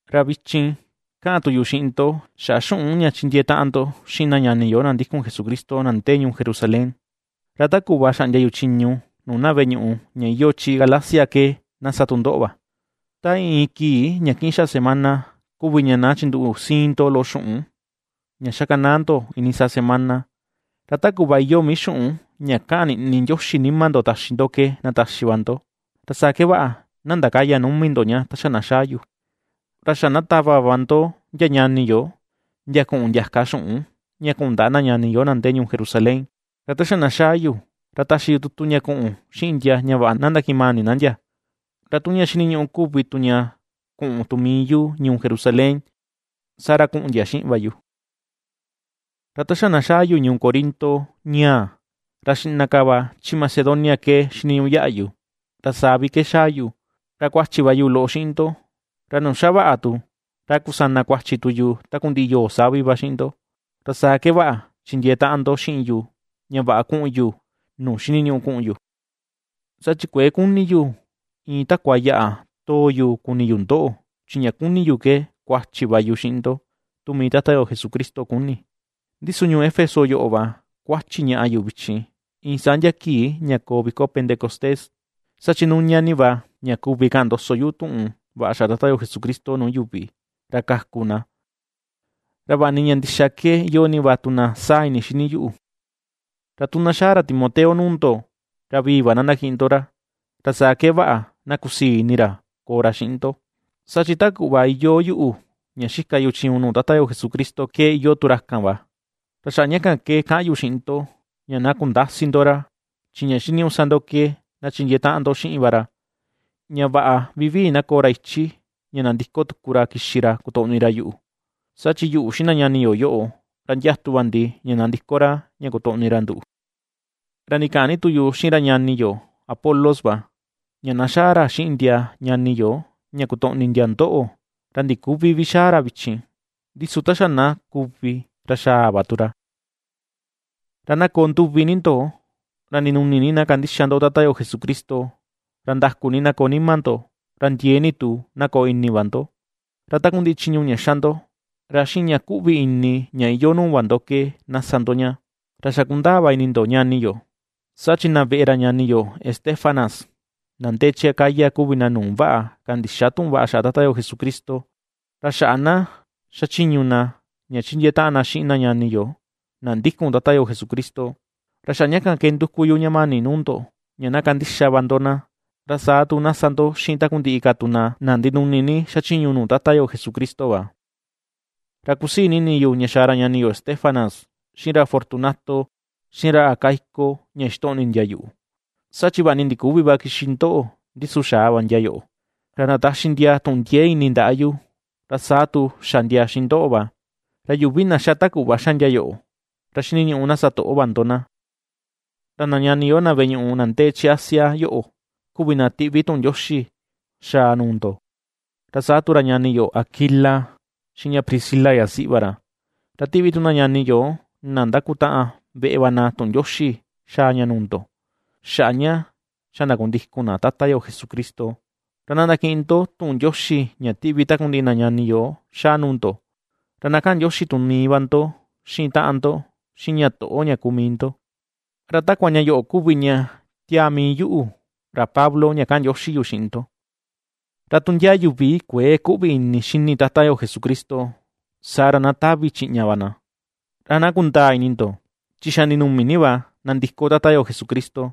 Ra vichin ^kaꞌan tu yu xiꞌin ndo xaꞌa xuꞌun ña chindiee taꞌan ndo xiꞌin na ñani yo na ndikun Jesucristo na ndee ñuu Jerusalén, ra ta kuꞌva xaꞌndia yu chiñu nuu na veꞌe ñuꞌu ña iyoo chi Galacia ke na sa tu ndoꞌo va. Ta iin, iin kii ña kiꞌin xaꞌa semana kuvi ña na chinduꞌu siin ndo loꞌo xuꞌun ña xakanaa ndo iinii saa semana, ra ta kuꞌva iyoo mii xuꞌun ña kaꞌan niꞌni Ndioxi nima ndo taxi ndo ke na taxi va ndo, ra saa ke vaꞌa na ndakäya numi ndo ña ta xa na xaa yu. Ra xa na tava va ndo ndia ñani yo, ndia kuꞌun ndiaka xuꞌun ña kuꞌun ndaꞌa na ñani yo na ndee ñuu Jerusalén, ra ta xa na xaa yu, ra taxi yu tutu ña kuꞌun xiꞌin ndia ña vaꞌa na ndakiꞌin mani na ndia. Ra tu ña xiniñuꞌu kuvi tu ña kuꞌun tu mii yu ñuu Jerusalén, saa ra kuꞌun ndia xiꞌin va yu. Ra ta xa na xaa yu ñuu Corinto ñaa, ra xiꞌna ka va chi Macedonia ke xiniñuꞌu yaꞌa yu, ra saa vi ke xaa yu. Ra kuachi va yu loꞌo xiꞌin ndo, ra nuu xa vaꞌa tu, ra a kusana kuachi tu yu takundiꞌi yoo savi va xiꞌin ndo, ra saa ke vaꞌa chindiee taꞌan ndo xiꞌin yu ña vaꞌa kuꞌun yu nuu xiniñuꞌu kuꞌun yu. Saa chi kuëe kuni yu iin takua yaꞌa too yu kuni yu ndoꞌo, chi ña kuni yu ke kuachi va yu xiꞌin ndo, tu mii Tata yo Jesucristo kuni. Ndi su ñuu Éfeso yoꞌo va kuachi ñaꞌa yu vichin, iin saa ndia kii ña koo viko Pentecostés. Saa chi nuña ni va ña kuvi ka̱ꞌa̱n ndoso yu tuꞌun vaꞌa xaꞌa Tata yo Jesucristo nuu yuvi, ra kaku na, ra vaꞌa ni ña ndixa ke iyoo ni va tu na saa ini xini yuꞌu. Ra tu na xaa ra Timoteo nuu ndo, ra vivii va na ndakiꞌin ndo ra, ra saa ke vaꞌa na kusii ini ra koo ra xiꞌin ndo, saa chi ta kuꞌva iyoo yuꞌu ña xika yu chiñu nuu Tata yo Jesucristo ke iyoo tu ra kan va. Ra xaꞌa ña kan ke kaꞌan yu xiꞌin ndo ña na kundäsi ndo ra. Chi ña xiniñuꞌu sa ndo ke, na chindiee taꞌan ndo xiꞌin va ra, ña vaꞌa vivii na koo ra ichi ña nandiko tuku ra kixi ra kotoꞌni ra yuꞌu, saa chi yuꞌu xiꞌin na ñani yo yoꞌo, ra ndiatu va ndi ña nandiko ra ña kotoꞌni ra nduꞌu. Ra ndikaꞌan ni tu yu xiꞌin ra ñani yo Apolos va ña na xaa ra xiꞌin ndia ñani yo ña kotoꞌni ndia ndoꞌo, ra ndiküvi vi xaa ra vichin, ndi su ta xa na kuvi ra xaa va tu ra. Ra na koo nduvi ni ndo, ra ndinuni ni na kandixa ndo Tata yo Jesucristo. Ra ndaku ni na koo nima ndo, ra ndiee ni tu na koo ini va ndo. Ra takundiꞌi chiñu ña xa ndo, ra xiꞌin ña kuꞌvi ini ña iyoo nuu va ndo ke na sa ndo ña. Ra xa kundaa va ini ndo, ñani yo, saa chi na veꞌe ra ñani yo Estéfanas, na ndee chi Acaya kuvi na nuu vaꞌa kandixa tuꞌun vaꞌa xaꞌa Tata yo Jesucristo, ra xaꞌa na xachiñu na ña chindiee taꞌan na xiꞌin na ñani yo, na ndikun Tata yo Jesucristo. Ra xaꞌa ña kan ke nduku yu ña mani nuu ndo ña na kandixa va ndo na, ra saa tu na sa ndo xiꞌin takundiꞌi ka tu na ndinuni ni xachiñu nuu Tata yo Jesucristo va. Ra kusii ni ini yu ña xaa ra ñani yo Estéfanas, xiꞌin ra Fortunato, xiꞌin ra Acaico ña ^xitoꞌni ndia yuꞌu, saa chi vaꞌa ni ndiküvi va kixi ndoꞌo, ndi su xaa va ndia yoꞌo. Ra ndataxi ndia tuꞌun ndiee ini ndaꞌa yu, ra saa tu xa ndia xiꞌin ndoꞌo va. Ra yuvi na ^xa ta kuꞌva ^xa ndia yoꞌo, ra xiniñuꞌu na sa toꞌo va ndo na. Ra na ñani yo, na veꞌe ñuꞌu na ndee chi Asia yoꞌo kuvi na tiꞌvi tuꞌun ndioxi xaa nuu ndo. Ra saa tu ra ñani yo Aquila, xiꞌin ña Priscila yasiꞌi va ra, ra tiꞌvi tu na ñani yo na ^ndakutaꞌan veꞌe va na tuꞌun ndioxi xaa ña nuu ndo, xaꞌa ña xa ndakundikun na Tata yo Jesucristo. Ra na ndakiꞌin ndo tuꞌun ndioxi ña tiꞌvi takundiꞌi na ñani yo xaa nuu ndo, ra na kaꞌan ndioxi tu mii va ndo xiꞌin taꞌan ndo, xiꞌin ña toꞌo ña kuu mii ndo. Ra takua ña yoꞌo kuvi ña tiaa mii yuꞌu, ra Pablo ña kaꞌan ndioxi yu xiꞌin ndo. Ra tu ndia yuvi kuëe küꞌvi ini xini Tata yo Jesucristo, saa ra na tavi chiꞌña va na. ¡Ra na kundaa ini ndo, chi xa ndinumi va nandiko Tata Jesucristo.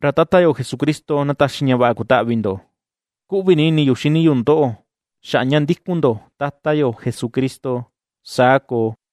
Ra Tata yo Jesucristo na taxi ña vaꞌa kutaꞌvi ndo. Kuꞌvi ni ini yu xini yu ndoꞌo xaꞌa ña ndikun ndo Tata yo Jesucristo. Saa koo.